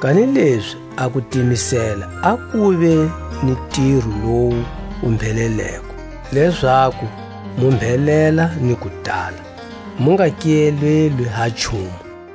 Kanilezi a kutimisela a kuve ni ntiro lowu wu mbheleleko, lezaku mu mbhelela ni ku tala, mu nga kiyelelwi ha nchumu.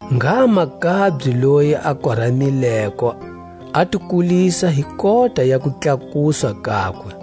Ngha makabye loyi a koramileko a ti kulisa hi kota ya kutlakuswa kakwe;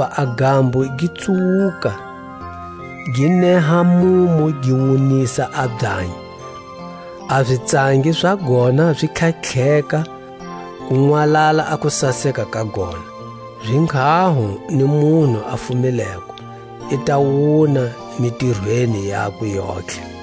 Hakuva a gambo gi tsuwuka, gi neha mumu gi wunisa a byanyi, a zitsangi za gona zi tlhatlheka, ku nwalala a kusaseka ka gona; zinghaho ni munhu a fumileko, i ta wuna mitirweni yakwe yontlhe. A minzhingo.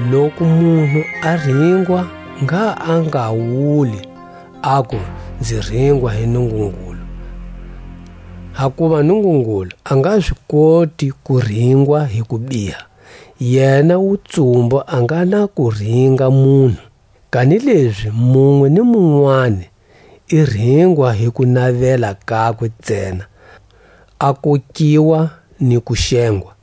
Loku munhu a ringwa ngha a nga wuli, aku: Nzi ringwa hi Nungungulu; hakuva Nungungulu a nga zi koti ku ringwa hi kubiha, yena wutsumbu a nga na ku ringa munhu. Kanilezi munwe ni munwani i ringwa hi kunavela kakwe ntsena, a kokiwa ni ku xengwa.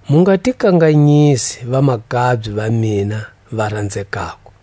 Mu nga ti kanganyisi, vamakabye va mina va ranzekako.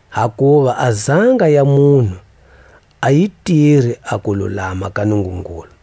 hakuva a zanga ya munhu a yi tiri a kululama ka Nungungulu.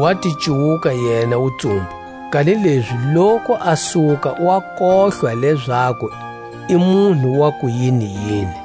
wa ti cuwuka yena wutsumbu, kanilezi loku a suka wa kohlwa lezaku i munhu wa ku yiniyini,